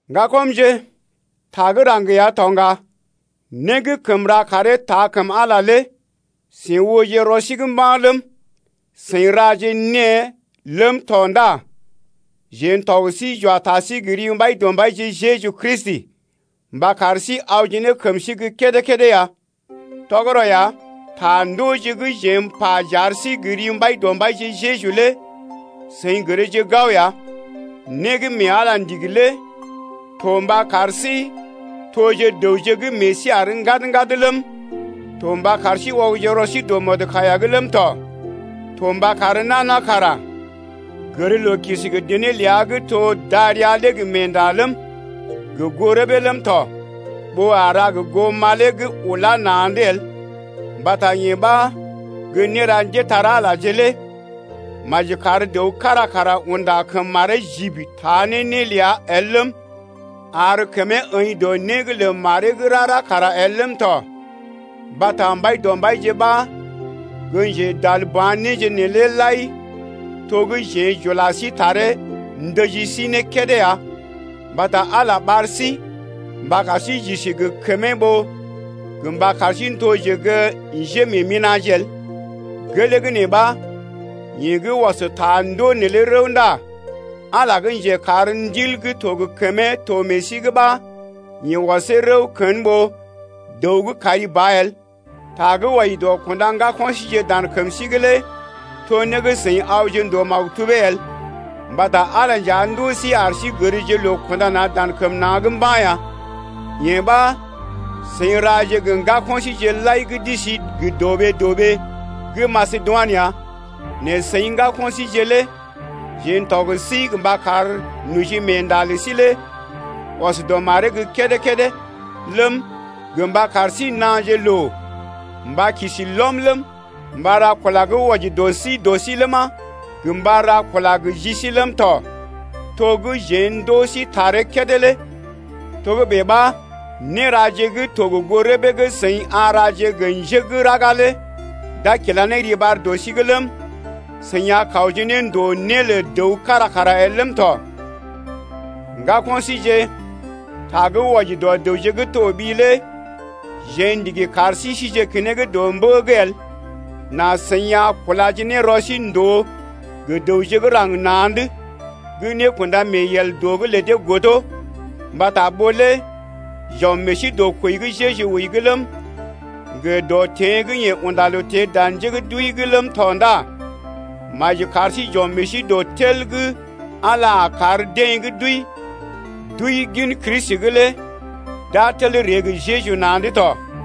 Ŋgakɔmje, ta gə́ raŋg ya to ŋga. Né gə́ kəm ra karee taa kəm Ala lé seḭ ooje rɔ sí’g mba̰ ləm, seḭ raje née ləm tɔ ndá jeḛ n’tɔg sí j’wa ta sí gə ri Mbaidɔmbaije Jeju Kristi mba kar sí awje ne kəm sí gə́ kédé-kédé ya. Tɔgərɔ ya, ta ndooje gə́ jeḛ m’pa j’ar sí gə ri Mbaidɔmbaije Jeju lé seḭ gərje gao ya. Né gə́ mee Ala ndigi lé to mba kar sí toje dəwje gə́ meḛ sí àr ŋgad-ŋgad ləm, to mba kar sí ɔgje rɔ sí dɔ mɔdkaiya’g ləm tɔ, to mba kar nana kara gər loo kisi gə dené ləa gə́ to gə́ darəa lé gə meenda ləm, gə goo rəbee ləm tɔ ɓó a ra gə goo malee gə́ ula na̰’d el mbata yee ɓa gə́ néra njépole-magəje lé. Maji kar dəw kára kara unda kəm maree jibi taa ne né ləa el ləm, ar kəmee əḭ dɔ né’g lə maree gə́ rara kara el ləm tɔ, mbata Mbaidɔmbaije ɓa gə́ njedalba̰ néje neelé lai to gə́ jeḛ j’ula sí taree ndəji sí ne kédé ya. Mbata Ala ɓar sí mba kar sí j’isi gə kəmee ɓó gə mba kar sí toje gə́ njémeemina̰je el. Gelee gə́ nee ɓa, yeḛ gə́ ɔs ta ndoo neelé rəw ndá Ala gə́ njekar Ndil gə́ to gə kəmee to meḛ sí’g ɓa yeḛ ɔsee rəw kən ɓó dəw gə́ kari ba el. Ta gə́ wɔji dɔ kunda ŋgako̰ síje dan kəm sí’g lé to né gə́ seḭ awje ndòo maktubee el, mbata Ala nja ndoo sí ar sí gərje loo kunda na̰ dan kəm na̰’d mba̰ ya. Yee ɓa seḭ raje gə ŋgako̰ síje lai gə́ d’isi gə dɔɓee dɔɓee gə́ Masedoinə ya. Nɛ seḭ ŋgako̰ síje lé jeḛ n’tɔg sí mba kar nojimeenda lə sí lé ɔs dɔ maree’g gə́ kédé-kédé ləm, gə mba kar sí naaje loo mba kisi lɔm ləm, mba ra kula gə́ wɔji dɔ sí dɔ sí ləma, gə mba ra kula gə ji sí ləm tɔ, to gə́ jeḛ ndoo sí taree kédé lé. Togə́bè ɓa, néraje gə́ to gə goo rəbee gə́ seḭ a raje gə njé gə́ raga lé d’a kila ne riɓar dɔ sí’g ləm, seḭ a kawje ne ndòo né lə dəw kára kara el ləm tɔ. Ŋgako̰ síje, ta gə́ wɔji dɔ dəwje gə́ toɓi lé jeḛ ndigi kar sí sije keneŋ dɔ mbə’g el, nà seḭ a kulaje ne rɔ sí ndòo gə dəwje gə́ raŋg na̰’d gə́ nékunda-mee-yel dɔ’g lə dee godo. Mbata ɓó lé j’ɔm meḛ sí dɔ kwəi gə́ Jeju wəi’g ləm, gə dɔ teḛ gə́ yeḛ unda loo teḛ dan njé gə́ d’wəi’g ləm tɔ ndá maji kar sí j’ɔm meḛ sí dɔ tel gə́ Ala a kar deḛ gə́ d’wəi gin Kristi’g lé d’a tel ree gə Jeju na̰’d tɔ.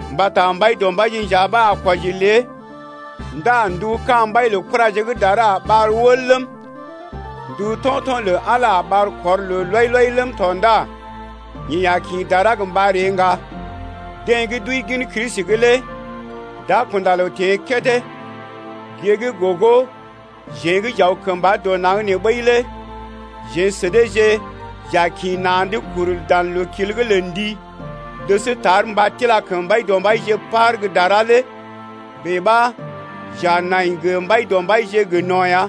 Mbata Mbaidɔmbaije nja ɓa a kwɔji lé ndá ndu ka̰ mbai lə kuraje gə́ dara a ɓar wəl ləm, ndu to̰to̰ lə Ala a ɓar kɔr loo lɔi-lɔi ləm tɔ ndá yeḛ a kḭ dara gə mba ree ŋga. Deḛ gə́ d’wəi gin Kristi’g lé d’a kunda loo teḛ kédé. Gée gə́ gogo jeḛ gə́ j’aw kəmba dɔ naŋg nee ɓəi lé jeḛ sə deeje j’a kḭ na̰’d kuru dan loo-kil’g lə ndi’g dəs tar mba tila kəm Mbaidɔmbaije par gə́ dara lé. Bèe ɓa j’a nai gə Mbaidɔmbaije gə no̰ ya.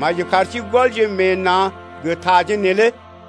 Maji kar sí gɔlje meḛ na̰ gə taje neelé.